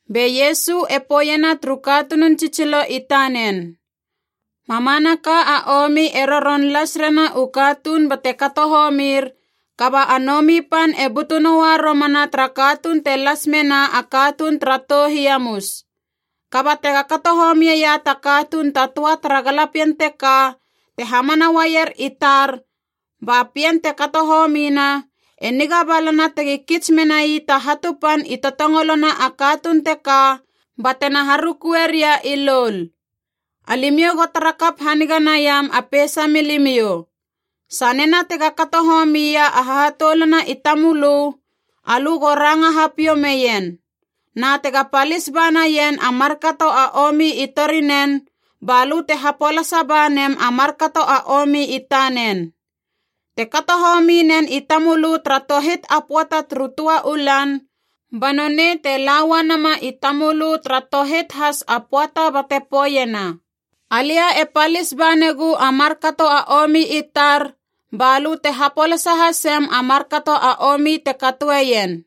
Be Iesu e poeiena turu katunun tsitsilo i tanen, “Mamanaka a omi e roron las rena u katuun bate kato homir, kaba a nomi pan e butu noua romana tara katuun te las mena a katuun tara tou hiamus! Kaba tega kato homieia ta katuun ta töa tara galapien teka te hamana uaier i tar ba pien te kato homina, e niga balana tegi kits menai ta hatu pan i totongolona a katuun teka batena harukue ria i loul! Alimiou go tara kap haniga naiam a peisa milimiou. “Sanena tega kato homia a hahatoulana i tamölö, alö go ranga hapiou meien. Na tega palis ba naien a markato a omi i torinen, ba lö te hapolasa ba nem a markato a omi i tanen. Te kato homi nen i tamölö tara tohit a pöata turu töa u lan, ba nonei te la uanama i tamölö tara tohit has a pöata bate poeiena, ‘Alia e palis ba negu a markato a omi i tar,’ ba lö te hapolasa hasem a markato a omi te katoeien.”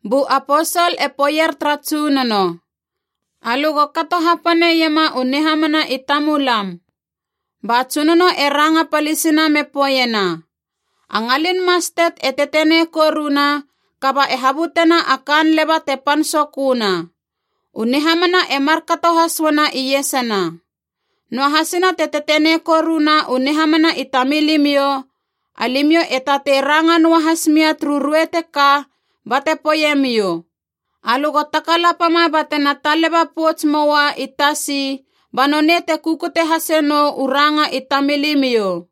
Bu Aposol e poeier tara Tsunono, “Alö go kato hapane iema u nihamana i tamulam.” Ba Tsunono e ranga palisina me poeiena, “A ngalin mastet e tetenei koruna, kaba e habutena a kaan leba te pan soköna. U nihamana e markato has uana iesana. Noahasina te tetenei koruna u nihamana i tamilimiou, alimiou e tatei ranga noa has mia turu ruei teka bate poeiemiou, ‘Alö go takalapama batena taleba pouts moua i tasi,’ ba nonei te kukute hase nou u ranga i tamilimiou!”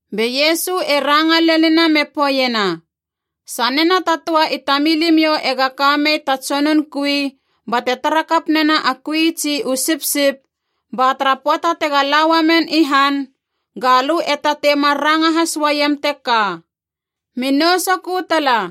Be Iesu e ranga lenina me poeiena, “Sanena ta töa i tamilimiou ega ka mei ta tsonun kui bate tara kap nena a kui tsi u sipsip, ba tara pöata tega la uamen i han, ga lö e tatei mar ranga has uaiem teka, ‘Mi nou sokö tala’?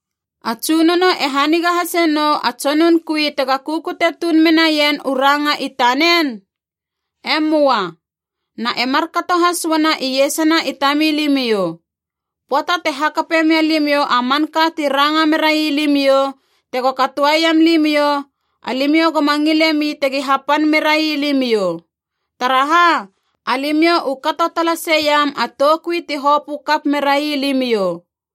A tsunono e haniga hase nou a tsonun kui tega kukute tuun menaien u ranga i tanen? E möa. Na e markato has uana iesana i tamilimiou. Pöata te hakape mia limiou a manka ti ranga merai limiou tego katoeiam limiou, alimiou goma ngilemi tegi hapan merai limiou. Taraha? Alimiou u kato talaseiam a toukui ti hopö kap merai limiou.”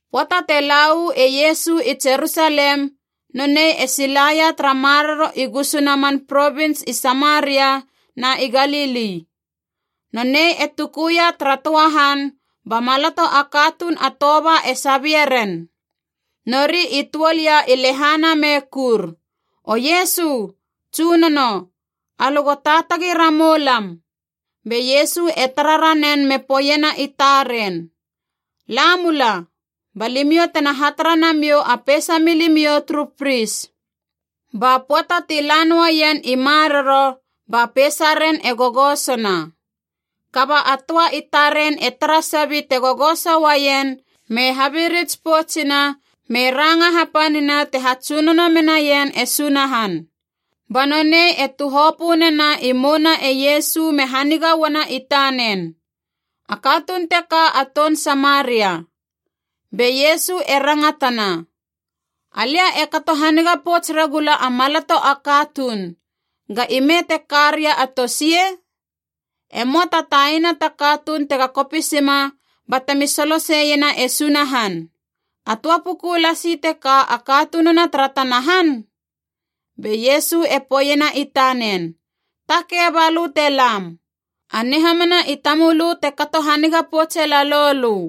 Pöata te la uu e Iesu i Jerusalem, nonei e silaia tara maroro i gusuna man provins i Samaria na i Galili. Nonei e tukuia tara töa han, ba maloto a katuun a toba e sabie ren. Nori i tuol ia i lehana me kur, “O Iesu! Tsunono! Alö go taatagi ramou lam!” Be Iesu e tara ranen me poeiena i taren, “La mula, ba limiou tena hatara namiou a peisa milimiou turu pris.” Ba pöata ti la noaien i maroro, ba peisaren e gogosona! Kaba a töa i taren e tara sabi te gogoso uaien me habirits poutsina me ranga hapanina te hatsunono menaien e Sunahan. Ba nonei e tuhopö nena i mouna e Iesu me haniga uana i tanen. A katuun teka a toun Samaria. Be Iesu e rangatana, “Alia e kato haniga pouts regula a maloto a katuun. Ga ime te ka ria a tosie? E möa ta taina ta katuun tega kopisima batemi soloseiena e Sunahan, a töa puku lasi teka a katununa tara tana han?” Be Iesu e poeiena i tanen, “Takei, balö te lam. A nihamana i tamölö te kato haniga poutse lalou lö.”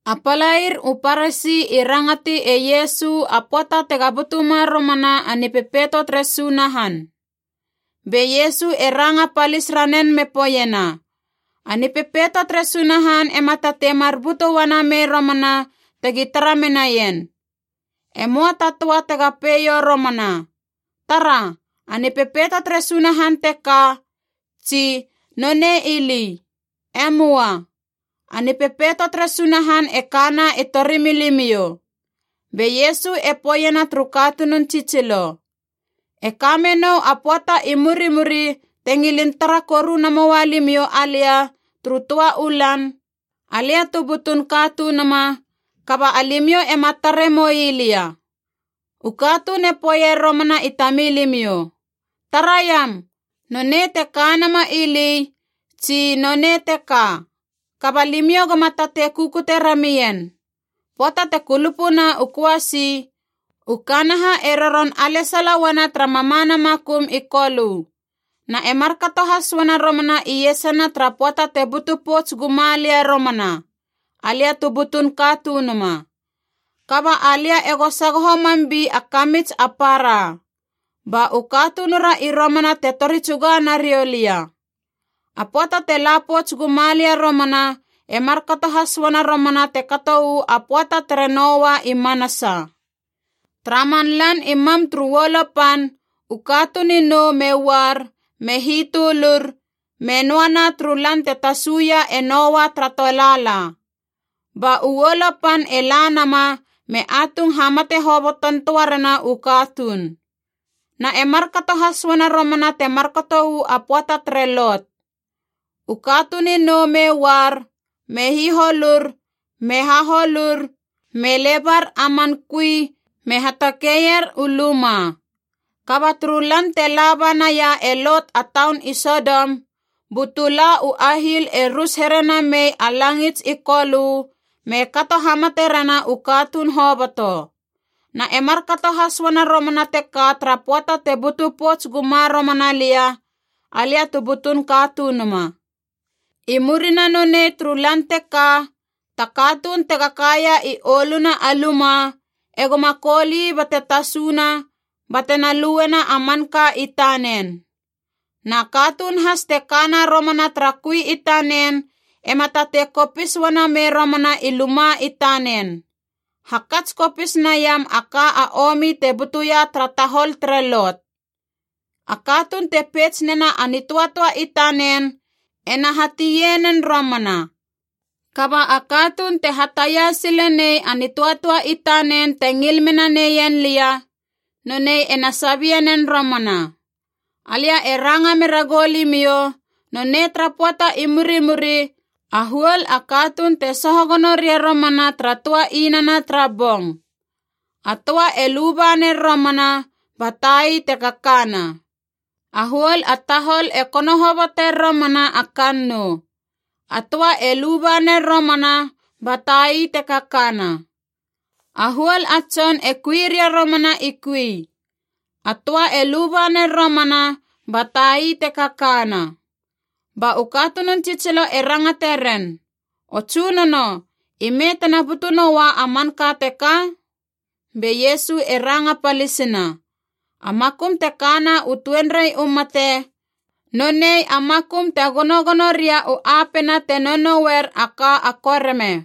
A palair u Parasi i rangati e Iesu a pöata tega butuma romana a Nipepeito tere Sunahan. Be Iesu e ranga palis ranen me poeiena, “A Nipepeito tere Sunahan ema tatei mar butu uana mei romana tegi tara menaien. E möa ta töa tega poeiou romana, ‘Tara, a Nipepeito tere Sunahan teka’ tsi, ‘Nonei ili!’ E möa. A nipepeito tere Sunahan e kana i torimilimiou.” Be Iesu e poeiena turu katunun tsitsilo, “E ka menou a pöata i murimuri te ngilin tara koru namoia limiou alia turu töa u lan, alia tu butun Katunuma, kaba alimiou ema tare moi lia. U katuun e poeier romana i tamilimiou, ‘Taraiam, nonei te kanama ili’ tsi, ‘Nonei teka!’ Kaba limiou goma tatei kukute ramien. Pöata te kulupuna u köasi, u kanaha e roron alesala uana tara mamana makum i kolö. Na e markato has uana romana iesana tara pöata te butu pouts guma lia romana, Alia tu butun Katunuma. Kaba alia ego sagoho mam bi a kamits a para. Ba u katunura i romana te tori tsuga nariou lia. A pöata te la pouts guma lia romana e markato has uana romana te kato uu a pöata tere Noa i manasa. Tara man lan i mam turu uolo pan, u katuun i nou me uar me hitölur, me noana turu lan te tasuia e Noa tara tolaala. Ba u uolo pan e la nama me atung hamate hobotontöa rena u katuun. Na e markato has uana romana te markato uu a pöata tere Lot. U katuun i nou me uar, me hiholur me haholur, me lebar a man kui me hatakeier u luma. Kaba turu lan te laba naia e Lot a taun i Sodom, bu tula u ahiil e rus here namei a langits i kolö me kato hamate rena u katuun hoboto. Na e markato has uana romana teka tara pöata te butu pouts guma romana lia, Alia tu butun Katunuma. “I murina nonei turu lan teka, ta katuun tega kaia i oluna a luma e goma koul ii bate tasuna batena luena a manka i tanen. Na katuun has te kana romana tara kui i tanen ema tatei kopis uana mei romana i luma i tanen. Hakats kopis naiam a ka a omi te butuia tara tahol tere Lot. A katuun te peits nena a nitöatöa i tanen ena hatie nen romana. Kaba a katuun te hataia sile nei a nitöatöa i tanen te ngil mena neien lia, nonei ena sabie nen romana. Alia e ranga mera goulimiou, nonei tara pöata i murimuri a huol a katuun te soho gono ria romana tara töa inana tara bong. A töa e luba ner romana ba tai te kakana. A huol a tahol e kono hoboter romana a kannou. A töa e luba ner romana ba tai te kakana. A huol a tson e kui ria romana i kui. A töa e luba ner romana ba tai te kakana.” Ba u katunun tsitsilo e rangate ren, “O Tsunono, ime tena butu noua a manka teka?” Be Iesu e ranga palisina, “A makum te kana u tuenrei u mate, nonei a makum te gonogono ria u apena te nounouer a ka a koreme.”